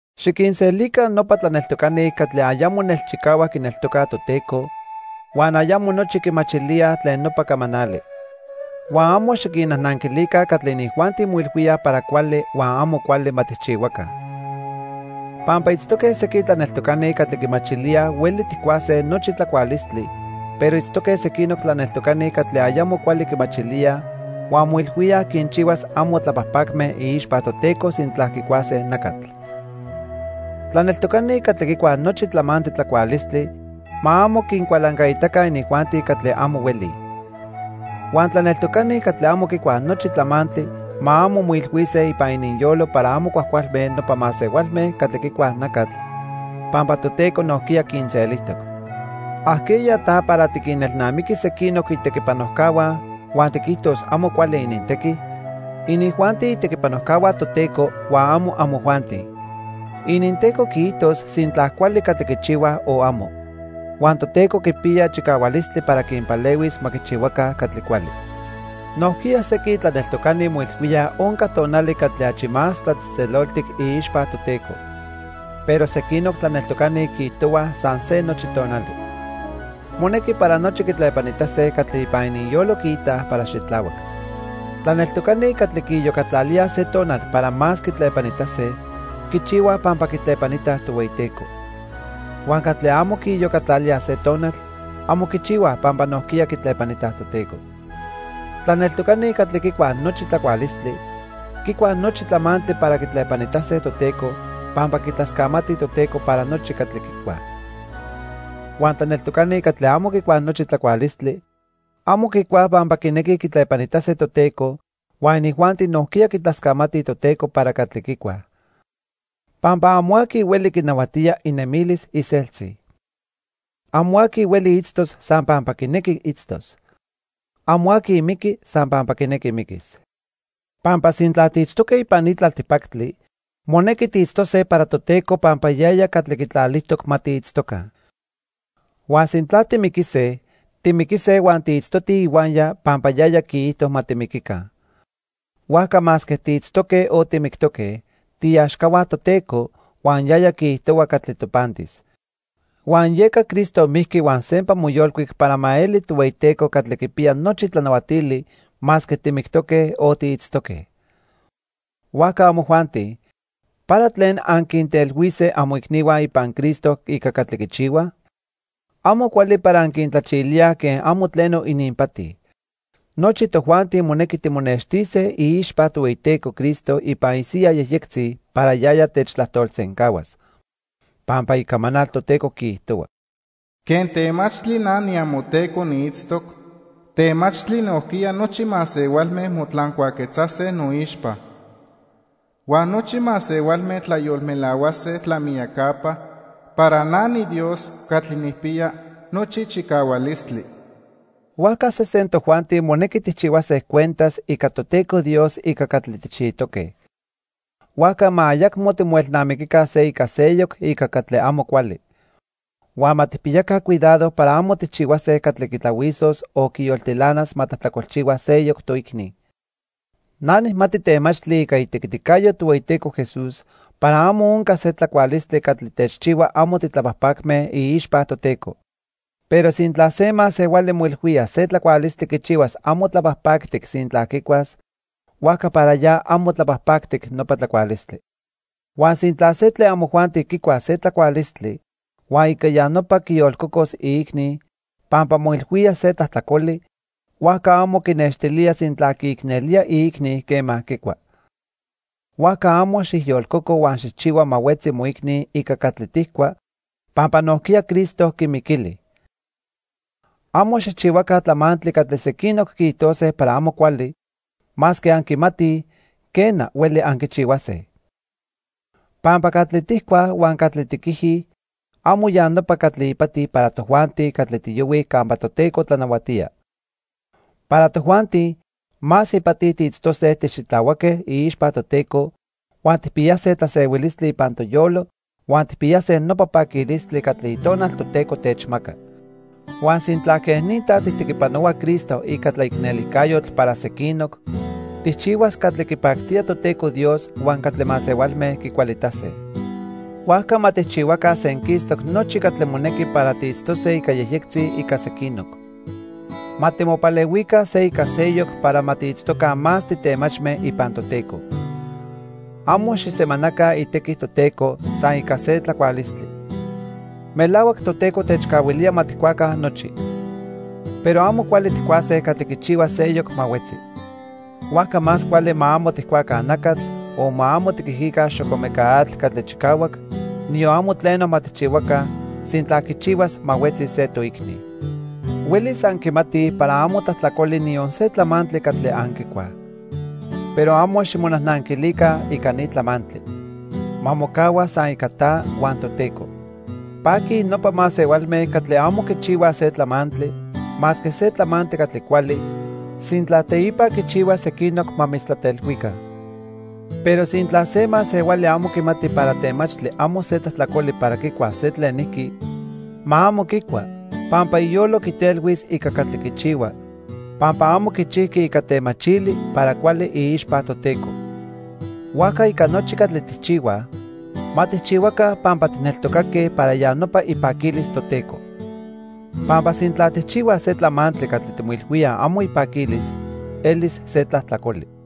Xiquinselica nopa tlaneltocani catli ayamo nelchicahuac quineltocaj Toteco, huan ayamo nochi quimachilíaj tlen nopa camanali. Huan amo xiquinnajnanquilica catli inijuanti moilhuíaj para cuali huan amo cuali ma tijchihuaca. Pampa itztoque sequin tlaneltocani catli quimachilíaj hueli tijcuase nochi tlacualistli, pero itztoque sequinoc tlaneltocani catli ayamo cuali quimachilíaj huan moilhuíaj quinchihuas amo tlapajpacme iixpa Toteco sintla quicuase nacatl. Tlaneltocani catli quicuaj nochi tlamantli tlacualistli ma amo quincualancaitaca inijuanti catli amo huelij. Huan tlaneltocani catli amo quicuaj nochi tlamantli ma amo moilhuise ipan ininyolo para amo cuajcualme nopa masehualme catli quicuaj nacatl, pampa Toteco nojquiya quinselijtoc. ¿Ajqueya ta para tiquinelnamiquis sequinoc itequipanojcahua huan tiquijtos amo cuali inintequi? Inijuanti itequipanojcahua Toteco huan amo amojuanti, amo. IninTeco quiijtos sintla cuali catli quichihuaj o amo. Huan Toteco quipiya chicahualistli para quinpalehuis ma quichihuaca catli cuali. Nojquiya sequin tlaneltocani moilhuíaj onca tonali catli achi más tlatzejtzeloltic iixpa Toteco. Pero sequinoc tlaneltocani quiijtohuaj san se nochi tonali. Monequi para nochi quitlepanitase catli ipan ininyolo quiitaj para xitlahuac. Tlaneltocani catli quiiyocatlalíaj se tonal para más quitlepanitase, quichihuaj pampa quitlepanitaj Tohueyiteco. Huan catli amo quiiyocatlalíaj se tonal, amo quichihuaj pampa nojquiya quitlepanitaj Toteco. Tlaneltocani catli quicuaj nochi tlacualistli, quicuaj nochi tlamantli para quitlepanitase Toteco pampa quitlascamatij Toteco para nochi catli quicuaj. Huan tlaneltocani catli amo quicuaj nochi tlacualistli, amo quicuaj pampa quinequij quitlepanitase Toteco huan inijuanti nojquiya quitlascamatij Toteco para catli quicuaj. Pampa amo aqui hueli quinahuatía inemilis iseltzi. Amo aqui hueli itztos san pampa quinequi itztos. Amo aqui miqui san pampa quinequi miquis. Pampa sintla tiitztoque ipan ni tlaltipactli, monequi tiitztose para Toteco pampa yaya catli quitlalijtoc ma tiitztoca. Huan sintla timiquise, timiquise huan tiitztotij ihuaya pampa yaya quiijto ma timiquica. Huajca masque tiitztoque o timictoque, tiiaxcahua Toteco, huan yaya quiijtohua catli topantis. Huan yeca Cristo mijqui huan sempa moyolcuic para ma eli Tohueyiteco catli quipiya nochi tlanahuatili, masque timictoque, o tiitztoque. Huajca amojuanti ¿para tlen anquintelhuise amoicnihua ipan Cristo ica catli quichihuaj? Amo cuali para anquintlachilíaj quen amo tleno ininpati. Nochi tojuanti monequi timonextise iixpa Tohueyiteco Cristo ipan isiyaj yejyectzi para yaya techtlajtolsencahuas. Pampa Icamanal Toteco quiijtohua: "Quen temachtli na niamoTeco niitztoc, temachtli nojquiya nochi masehualme motlancuaquetzase noixpa. Huan nochi masehualme tlayolmelahuase tlamiyacapa para na niDios catli nijpiya nochi chicahualistli." Huajca sesen tojuanti monequi tijchihuase cuentas ica Toteco Dios ica catli tijchijtoque. Huajca ma ayacmo timoelnamiquica se ica seyoc ica catli amo cuali. Huan ma tijpiyaca cuidado para amo tijchihuase catli quitlahuisos o quiyoltilanas ma tlajtlacolchihua seyoc toicni. Na nijmati temachtli ica itequiticayo Tohueyiteco Jesús para amo onca se tlacualistli catli techchihua amo titlapajpacme iixpa Toteco. Pero sintla se masehuali moilhuía se tlacualistli quichihuas amo tlapajpactic sintla quicuas, huajca para ya amo tlapajpactic nopa tlacualistli. Huan sintla se tlen amojuanti quicuas se tlacualistli, huan ica ya nopa quiyolcocos iicni, pampa moilhuía se tlajtlacoli, huajca amo quinextilía sintla quiicnelía iicni quema quicua. Huajca amo xijyolcoco huan xijchihua ma huetzi moicni ica catli tijcua, pampa nojquiya Cristo quimiquili. Amo xijchihuaca tlamantli catli sequinoc quiijtose para amo cuali, masque anquimatij, quena, hueli anquichihuase. Pampa catli tijcuaj huan catli tiquijij amo ya nopa catli ipati para tojuanti catli tiyohuij campa Toteco tlanahuatía. Para tojuanti, más ipati tiitztose tixitlahuaque iixpa Toteco, huan tijpiyase tlasehuilistli ipan toyolo huan tijpiyase nopa paquilistli catli Itonal Toteco techmaca. Huan sintla quej ni ta tijtequipanohua Cristo ica tlaicnelijcayotl para sequinoc, tijchihuas catli quipactía Toteco Dios huan catli masehualme quicualitase. Huajca ma tijchihuaca senquistoc nochi catli monequi para tiitztose ica yejyectzi ica sequinoc. Ma timopalehuica se ica seyoc para ma tiitztoca más titemachme ipan Toteco. Amo xijsemanaca itequi Toteco san ica se tlacualistli. Melahuac Toteco techcahuilía ma tijcuaca nochi. Pero amo cuali tijcuase catli quichihuas seyoc ma huetzi. Huajca más cuali ma amo tijcuaca nacatl, o ma amo tiquijica xocomeca atl catli chicahuac, niyon amo tleno ma tijchihuaca, sintla quichihuas ma huetzi se toicni. Huelis anquimatij para amo tlajtlacoli niyon se tlamantli catli anquicuaj. Pero amo ximonajnanquilica ica ni tlamantli. Ma mocahua san ica ta huan Toteco. Paquij nopa masehualme catli amo quichihuaj se tlamantli, masque se tlamantli catli cuali, sintla teipa quichihuas sequinoc ma mitztlatelhuica. Pero sintla se masehuali amo quimati para temachtli amo se tlajtlacoli para quicuas se tlenijqui, ma amo quicua, pampa iyolo quitelhuis ica catli quichihua, pampa amo quichijqui ica temachili para cuali iixpa Toteco. Huajca ica nochi catli tijchihuaj, ma tijchihuaca pampa tijneltocaque para ya nopa ipaquilis Toteco. Pampa sintla tijchihuaj se tlamantli catli timoilhuíaj amo ipaquilis, elis se tlajtlacoli.